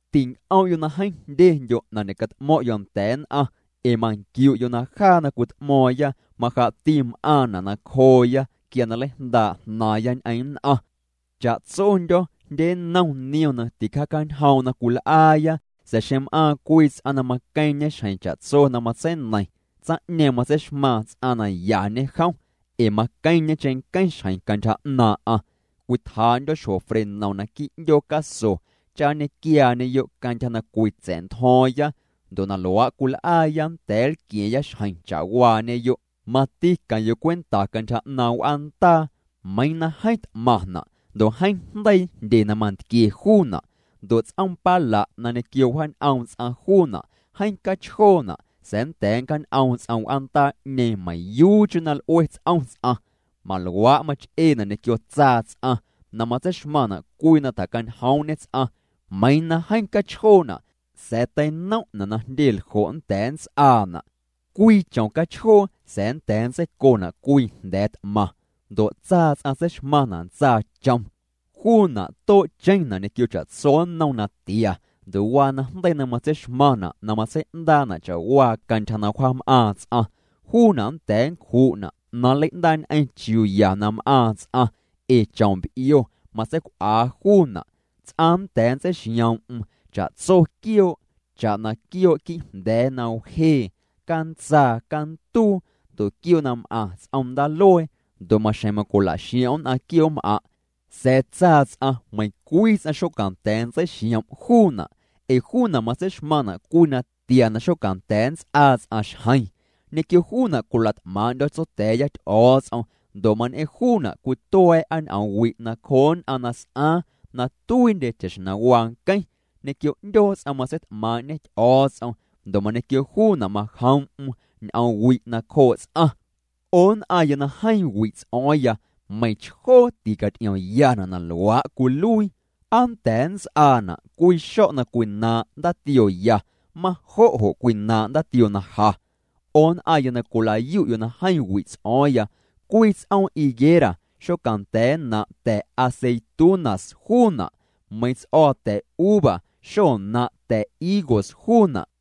Tinc'om'yo' na jeeⁿ jndyendyo' na ñe'cat'mo̱ⁿ'yo' nda̱a̱ nn'aⁿ, ee manquiu'yo' na jaa na cwit'mo̱o̱ⁿya majaa'ti m'aaⁿna' nacjooya quia na nleijndaa' jnaaⁿya ñ'eⁿ nn'aⁿ. Cha'tsondyo̱ jndye nnom niom na ticjaacanjoom' na cwil'aaya, sa̱a̱ xeⁿ m'aaⁿ cwii ts'aⁿ na maqueⁿñe xjeⁿ cha'tso na matseineiⁿ, tsaⁿ'ñeeⁿ matseixmaaⁿ ts'aⁿ na yañe jom, ee maqueⁿñe cheⁿnqueⁿ xjeⁿ cantyja 'naaⁿ'aⁿ. Cwitjaa'ndyo̱ xjo frenom naquii' 'ndyoo caso cha nñequiaañeyo' cantyja na cwitsa̱'ntjo̱o̱ⁿya. Ndo' na luaa' cwil'aaya nnda̱a̱ nlqua̱a̱ⁿya xjeⁿ cha'waañeyo'. Mati queⁿ'yo' cwenta cantyja 'naaⁿ' w'aandaa, meiiⁿ na jeeⁿ t'maⁿna' ndo' jeeⁿ jndeii jndye na mantquie juuna', ndo' ts'oom pala' na ñequio wjaañ'oom ts'aⁿ juuna' jeeⁿ cachjoona', sa̱a̱ nnda̱a̱ nncjaañ'oom ts'aⁿ w'aandaa'ñeeⁿ meiⁿyuucheⁿ na l'ue ts'om ts'aⁿ. Maluaa' mach'eena' ñequio tsaa ts'aⁿ na matseixmaⁿna' cwii na tjacañjoom'ñe ts'aⁿ, meiiⁿ na jeeⁿ cachjoona' sa̱a̱ teinom'na' na jndye ljo' nnda̱a̱ nnts'aana'. Cwii chom cachjoo sa̱a̱ nnda̱a̱ nntseicona' cwii jnda̱a̱ t'maⁿ. Ndo' tsaa ts'aⁿ tseixmaⁿna' ntsaachom. Juuna' too'cheⁿna' ñequio cha'tso nnom natia ndo' waa najndeii na matseixmaⁿna' na matsei'ndaa'na' cha'waa cantyja na wjaam'aaⁿ ts'aⁿ. Juuna' nnda̱a̱ nncju'na' na nlei'ndaa'ñ'eⁿ chiuu ya na m'aaⁿ ts'aⁿ, ee chom b'io matseic'uaa juuna'. Ts'aⁿ nnda̱a̱ nntseixioom'm cha'tso quioo', cha'na: quioo' quii'jnda̱a̱ na wjee, cantsaa, canduu, ndo' quioo' na m'aⁿ ts'om ndaaluee, ndo' maxjeⁿ macwila'xiom' nn'aⁿ quioo'm'aⁿ'. Sa̱a̱ tsaa ts'aⁿ meiⁿcwii ts'aⁿ xocanda̱a̱ nntseixiom' juuna', ee juuna' matseixmaⁿna' cwii natia na xonda̱a̱ nts'aa ts'aⁿ xjeⁿ. Ñequio juuna' cwila't'maaⁿ'ndyo̱ Tsotya̱a̱ya Ty'o̱o̱ts'om ndo' mañ'eⁿ juuna' cwitua̱a̱'a ñ'oomwi' nacjoo nn'aⁿ na s'aaⁿ na tuiindye cha'xjeⁿ na waa nqueⁿ. Ñequio 'ndyoo ts'aⁿ matseit'maaⁿ'ñê Ty'o̱o̱ts'om ndo' mañequio juuna' majoom'm n'oomwi' nacjoo' ts'aⁿ. 'O nn'aⁿya na jeeⁿ wi' ts'o̱o̱ⁿya, meiⁿchjoo ticaty'iomyana' na luaa' cwiluii. ¿Aa nnda̱a̱ nnts'aana' cwii xo̱' na cwinaaⁿ' ndaatiooya majo' jo' cwinaaⁿ' ndaatioo na ja? 'O nn'aⁿya na cwila'yu'yo' na jeeⁿ wi' ts'o̱o̱ⁿya, cwii ts'oom higuera xocanda̱a̱ nnaⁿ' ta̱ aceitunas juuna', meiⁿ ts'o̱o̱ ta̱uva xonnaⁿ' ta̱ higos juuna'.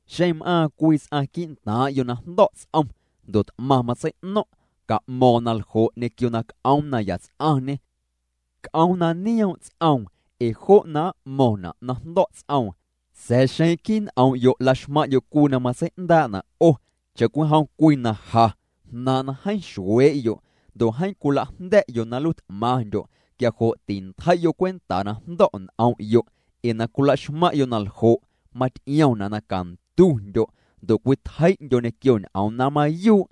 Xeⁿ na m'aaⁿ cwii ts'aⁿ quii'ntaaⁿ'yo' na jndo̱' ts'om, ndo' t'maⁿ matsei'no̱ⁿ', ca'mo̱o̱ⁿ na ljo' ñequio na c'oom na yats'aⁿñê, c'oom na nioom' ts'oom ee jo' na m'mo̱ⁿna' na jndo̱' ts'oom. Sa̱a̱ xeⁿ quii' n'om'yo' laxmaⁿ'yo' cwii na matsei'ndaa'na' 'o cha'cwijom cwii na ja jnaaⁿ' na jeeⁿ xuee'yo' ndo' jeeⁿ cwila'jnda̱'yo' na nluii t'maⁿndyo', quia jo' tintjei'yo' cwenta na jndo̱' n'om'yo', ee na cwilaxmaⁿ'yo' na ljo' maty'iomna' na cantundyo' ndo' cwitjei'ndyo' ñequio ñ'oom na mayuu'.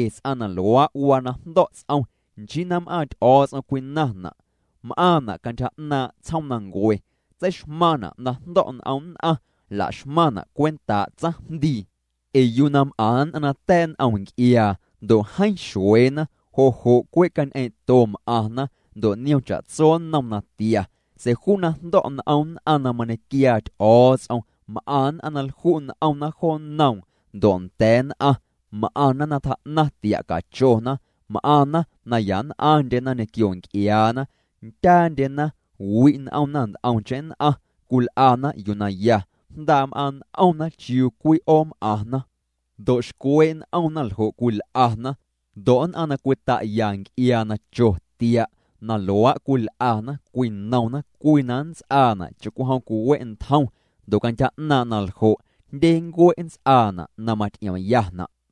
Ee ts'aⁿ na luaa' waa na jndo̱' ts'om nchii na m'aaⁿ Ty'o̱o̱ts'om cwinaⁿna', m'aaⁿna' cantyja 'naaⁿ' tsjoomnancue, tseixmaⁿna' na jndo̱' n'om nn'aⁿ, laxmaⁿna' cwentaa' tsaⁿjndii. Ee yuu na m'aⁿ nn'aⁿ na ta̱a̱' n'om nc'iaa, ndo' jeeⁿ xueena, jo' jo' cwe' cañ'eeⁿ'to m'aⁿna, ndo' niom cha'tso nnom natia. Sa̱a̱ juu na jndo̱' n'om nn'aⁿ na mañequiaa Ty'o̱o̱ts'om, m'aⁿ nn'aⁿ na lju' n'omna jo nnoom ndo' nda̱a̱ nn'aⁿ, m'aⁿna na tjaa'naⁿ tia' cachona, m'aⁿna na yann'aⁿndye ñequio nc'iaana, ndyaandyena, wi' n'omna nt'omcheⁿ nn'aⁿ, cwil'ana yuu na ya, jndaa' m'aaⁿ' n'omna chiuu cwi'oom'aⁿna, ndo' xcwee' n'omna ljo' cwil'ana. Ndo' nn'aⁿ na cwita'ya nc'iaa na cho tia', na luaa' cwil'ana cwinomna cwii na nnts'aana' cha'cwijom cwiwe' ntjom ndo' cantyja 'naaⁿ' naljo', jndye ncue' nnts'aana' na maty'iomyana'.